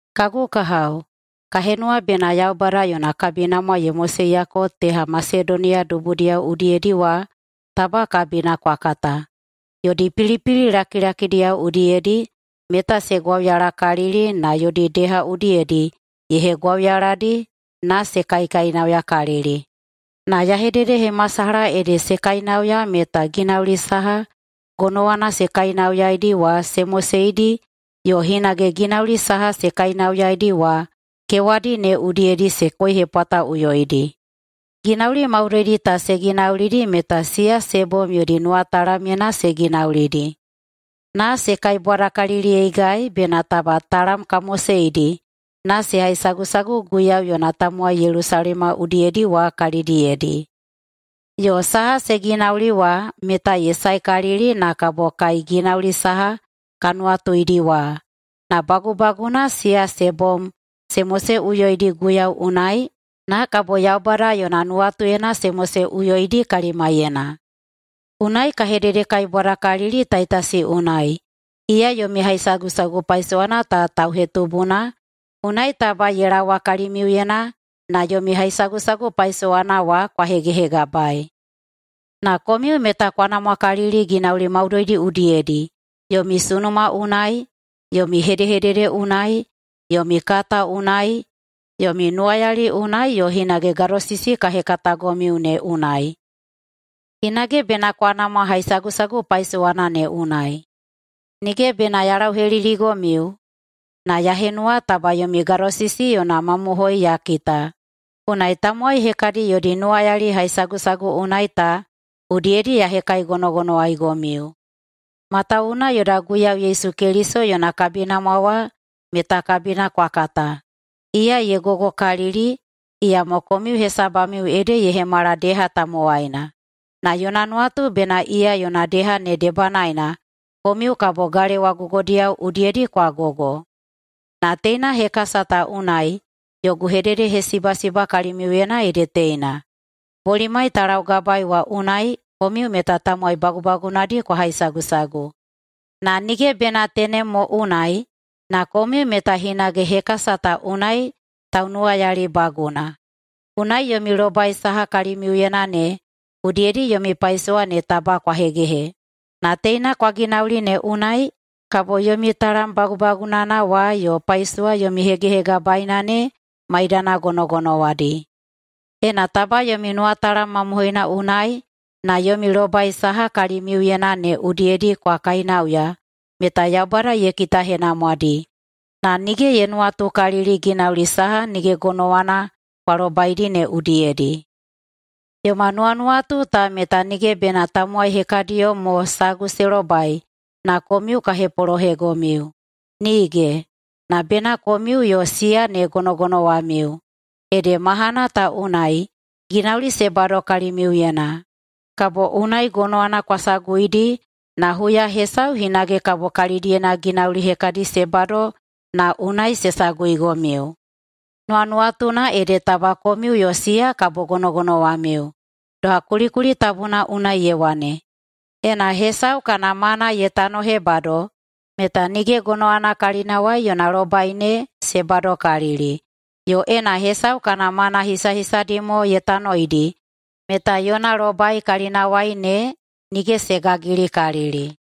Kagu kahao, ka henuwa bena Yaubada yona kabinamwa ye moseiyako teha Masedoniya dubudiyao udiyedi wa taba kabina kwa kata. Yodi pilipili lakilakidiyao udiyedi meta se gwauyalakalili na yodi deha udiyedi ye hegwauyaladi na se kaikainauyakalili. Na ya hededehemasalaha ede se kainauya meta ginauli saha gonowana se kainauyaeidi wa se moseidi yo hinage ginauli saha se kainauyaeidi wa kewadi ne udiyedi se koihepwataꞌuyoidi. Ginauli maudoidi ta se ginaulidi meta siya se bom yodi nuwatalamyena se ginaulidi, na se kaibwadakaliliyeigai bena taba talam ka moseidi na se haisagusagu Guiyau yona tamowai [Yelusalema udiyedi] wa kalidiyedi. Yo saha se ginauli wa meta ye saekalili na kabo kai ginauli saha ka nuwatuidi wa, na bagubaguna siya se bom se moseꞌuyoidi Guiyau unai na kabo Yaubada yona nuwatuyena se moseꞌuyoidi kalimaiyena. Unai ka hededekaibwadakalili Taitasi unai, iya yomi haisagusagu paisowana ta tauhetubuna, unai taba ye laowa kalimiuyena na yomi haihaisagusagu paisowana wa kwa hegehegabaei. Na komiu meta kwa namwakalili ginauli maudoidi udiyedi, yomi sunuma unai, yomi hedehedede unai, yomi kata unai, yomi nuwayali unai yo hinage gadosisi ka hekatagomiu ne unai. Hinage bena kwa namwa haisagusagu paisowana ne unai. Nige bena ya lauheliligomiu, na ya henuwa taba yomi gadosisi yona mamohoi ya kita, unai tamowai hekadi yodi nuwayali haisagusagu unai ta udiyedi ya hekaigonogonowaeigomiu. Matawuwuna yoda Guiyau Yesu Keliso yona kabinamwa wa meta kabina kwa kata. Iya ye gogokalili, iyamo komiu hesabamiu ede ye hemala deha tamowaina, na yona nuwatu bena iya yona deha ne debanaena komiu kabo [galewa gogodiyao udiyedi] kwa gogo. Na teina hekasa ta unai yogu hededehesibasiba kalimiuyena ede teina: Bolimai ta laugabaei wa unai komiu meta tamowai bagubagunadi kwa haisagusagu. Na nige bena tenem mo unai, na komiu meta hinage hekasa ta unai taunuwayalibaguna. Unai yomi lobai saha kalimiuyena ne udiyedi yomi paisowa ne taba kwa hegehe, na teina kwa ginauli ne unai kabo yomi talam bagubagunana wa yo paisowa yomi hegehegabaeina ne maidana gonogonowadi. Ena taba yomi nuwatalam mamohoina unai na yomi lobai saha kalimiuyena ne udiyedi kwa kainauya meta Yaubada ye kitahenamwadi, na nige ye nuwatukalili ginauli saha nige gonowana kwa lobaidi ne udiyedi. Yoma nuwanuwatu ta meta nige bena tamowai hekadiyo mo sagu se lobai na komiu ka hepolohegomiu, nige! Na bena komiu yo siya ne gonogonowamiu. Ede mahana ta unai ginauli se bado kalimiuyena, kabo unai gonowana kwa saguidi, na huya hesau hinage kabo kalidiyena ginauli hekadi se bado na unai se saguigomiu. Nuwanuwatuna ede taba komiu yo siya kabo gonogonowamiu. Doha kulikuli tabuna unai ye wane, “Ena hesau kana mana ye tanohebado, meta nige gonowana kalinawai yona lobai ne se badokalili, yo ena hesau kana mana hisahisadi mo ye tanoidi meta yona lobai kalinawai ne nige se gagilikalili.”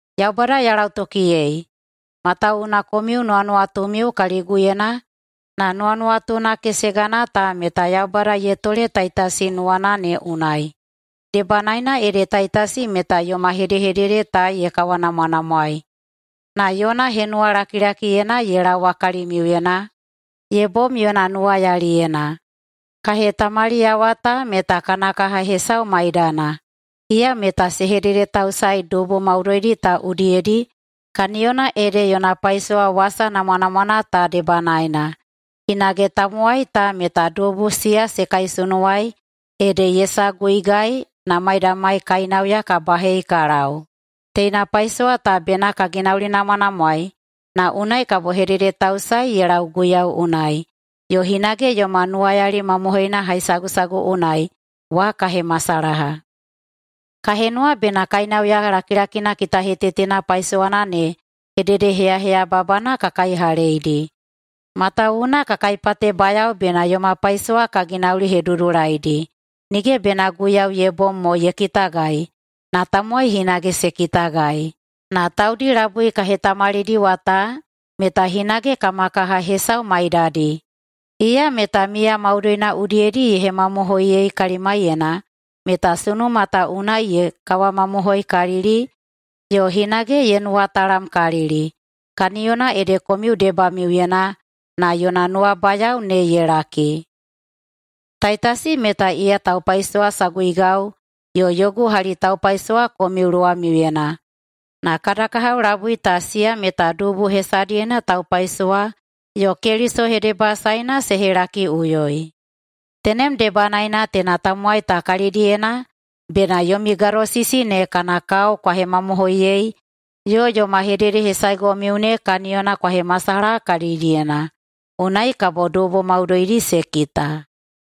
Yaubada ya lautokiyei, matawuwuna komiu nuwanuwatumiu kaliguyena na nuwanuwatuna kesegana ta meta Yaubada ye tole Taitasi nuwana ne unai. Debanaena ede Taitasi meta yoma hedehedede ta ye kawanamwanamwaei na yona henuwalakilakiyena ye laowa kalimiuyena ye bom yona nuwayaliyena. Ka hetamaliyawa ta meta kana kaha hesau maidana, iya meta se hededetausaei dubu maudoidi ta udiyedi kaniyona ede yona paisowa wasa namwanamwana ta debanaena. Hinage tamowai ta meta dubu siya se kaisunuwai ede ye saguigai na maidamai kainauya ka bahei ka lau. Teina paisowa ta bena ka ginaulinamwanamwaei na unai kabo hededetausae ye lau Guiyau unai, yo hinage yoma nuwayali mamohoina haisagusagu unai wa ka hemasalaha. Ka henuwa bena kainauya lakilakina kitahetetena paisowana ne hededeheyaheyababana ka kaihaleidi, matawuwuna ka kaipatebayao bena yoma paisowa ka ginaulihedudulaidi, nige bena Guiyau ye bom mo ye kitagai, na tamowai hinage se kitagai. Na taudi labui ka hetamalidiwa ta meta hinage kabo kama kaha hesau maidadi, iya meta miya maudoina udiyedi ye hemamohoiyei kalimaiyena meta sunuma ta unai ye kawamamohoikalili yo hinage ye nuwatalamkalili. Kaniyona ede komiu debamiuyena na yona nuwabayao ne ye laki. Taitasi meta iya taupaisowasaguigau yo yogu halitaupaisowa komiu luwamiuyena, na kada kahao labui ta siya meta dubu hesadiyena taupaisowa yo Keliso hedebasaena se helakiꞌuyoi. Tenem debanaena teina tamowai ta kalidiyena bena yomi gadosisi ne kana kao kwa hemamohoiyei yo yoma hededehesaegomiu ne kaniyona kwa hemasalaha kalidiyena, unai kabo dubu maudoidi se kita.